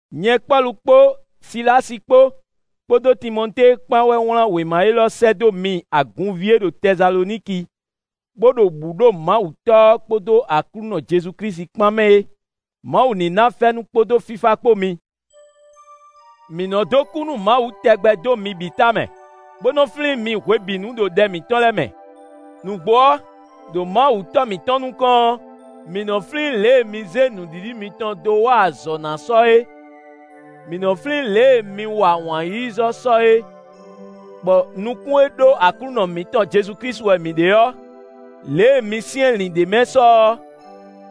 Nyɛ Pɔ́lu kpó Silási kpó, kpódó Timɔtée kpán wɛ wlán wěma élɔ́ sɛ́ dó mi agunví e ɖo Tɛsaloniki bó ɖo bǔ ɖo Mawu Tɔ́ ɔ́ kpódó Aklúnɔ Jezu Klísu kpán mɛ é. Mawu ní ná fɛ́nú kpódó fífá kpó mi. Mǐ nɔ dó kú nú Mawu tɛgbɛ dó mi bǐ tamɛ, bó nɔ flín mi hwebǐnu ɖo ɖɛ mǐtɔn lɛ́ɛ mɛ. Nǔgbó ɔ́, ɖo Mawu Tɔ́ mǐtɔn nukɔn ɔ́, mǐ nɔ́ flín lě e mi zé nǔɖiɖi mitɔn dó wa azɔ̌ ná sɔ é, mǐ nɔ́ flín lě e mi wa wǎn-yíyízɔ́ sɔ é; bɔ nukún e ɖó Aklúnɔ mǐtɔn Jezu Klísu wɛ mǐ ɖe ɔ́, lě e mi syɛ́nlǐn ɖ'é mɛ sɔ ɔ́,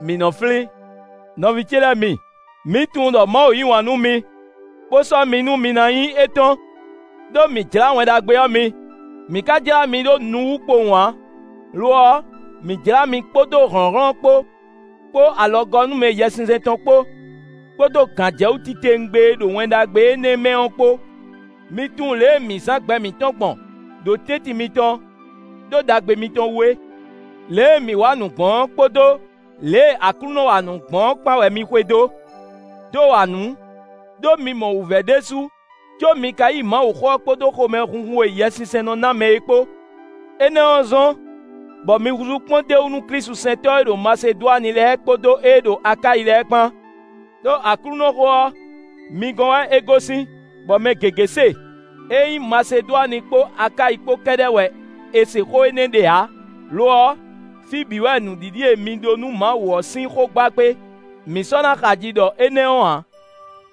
mǐ nɔ́ flín. Nɔví ce lɛ́ɛ mi, mǐ tunwun ɖɔ Mawu yí wǎn nú mi, bó sɔ́ mi nú mi ná nyí étɔn. Đó mǐ jlá Wɛn Ɖagbe ɔ́ mi; mǐ ka jlá mi ɖó nu wú kpowun ǎ; lo ɔ́, mǐ jlá mi kpódó hlɔ̌nhlɔ́n kpó, kpó alɔgɔ́númɛ Yɛsinsɛn tɔn kpó, kpódó gǎnjɛwú titewungbe e ɖo Wɛn Ɖagbe énɛ́ mɛ ɔ́ kpó. Mi tunwun lě e mǐ zán gbɛ mǐtɔn gbɔn ɖo tɛ́ntin mitɔn, ɖó ɖagbe mitɔn wú é. Lě e mǐ wa nǔ gbɔn ɔ́ kpódó lě e Aklúnɔ wa nǔ gbɔn ɔ́ kpán wɛ mi xwedó, dó wa nǔ, ɖó mi mɔ wǔvɛ́ ɖésú, có mi ka yí Mawuxó ɔ́ kpódó xomɛhunhun e Yɛsinsɛn nɔ ná mɛ é kpó. Énɛ́ ɔ́ zɔ́n, bɔ mi húzú kpɔ́ndéwú nú klísusɛntɔ́ e ɖo Masedwani lɛ́ɛ kpódó ée ɖo Akáyi lɛ́ɛ kpán. Đó Aklúnɔxó ɔ́, mi gɔ́n wɛ é gosín, bɔ mɛ gěgé se; é nyí Masedwani kpó Akáyi kpó kɛ́ɖɛ́ wɛ è se xó énɛ́ ɖe ǎ; lo ɔ́, fí bǐ wɛ nǔɖiɖi e mi ɖó nú Mawu ɔ́ sín xó gba kpé; mǐ sɔ́ ná xaji ɖɔ énɛ́ ɔ́ ǎ.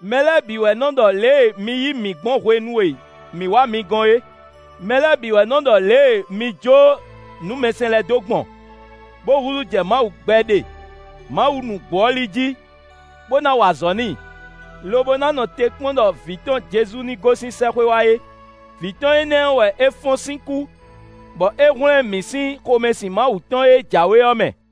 Mɛ lɛ́ɛ bǐ wɛ nɔ́ ɖɔ lě e mi yí mǐ gbɔn hwenu e mǐ wá mi gɔ́n é; mɛ lɛ́ɛ bǐ wɛ nɔ́ ɖɔ lě e mi jó nǔmɛsɛn lɛ́ɛ dó gbɔn, bó húzú jɛ Mawu gbɛɖe, Mawu nǔgbó ɔ́ li jí, bó ná wa azɔ̌ n'i, lobo ná nɔ te kpɔ́n ɖɔ vǐ tɔn Jezu ní gosín sɛ́xwé wá é. Vǐ tɔn énɛ́ ɔ́ wɛ é fɔ́n sín kú, bɔ é hwlɛ́n mǐ sín xomɛsin Mawu tɔn e jǎwe ɔ́ mɛ.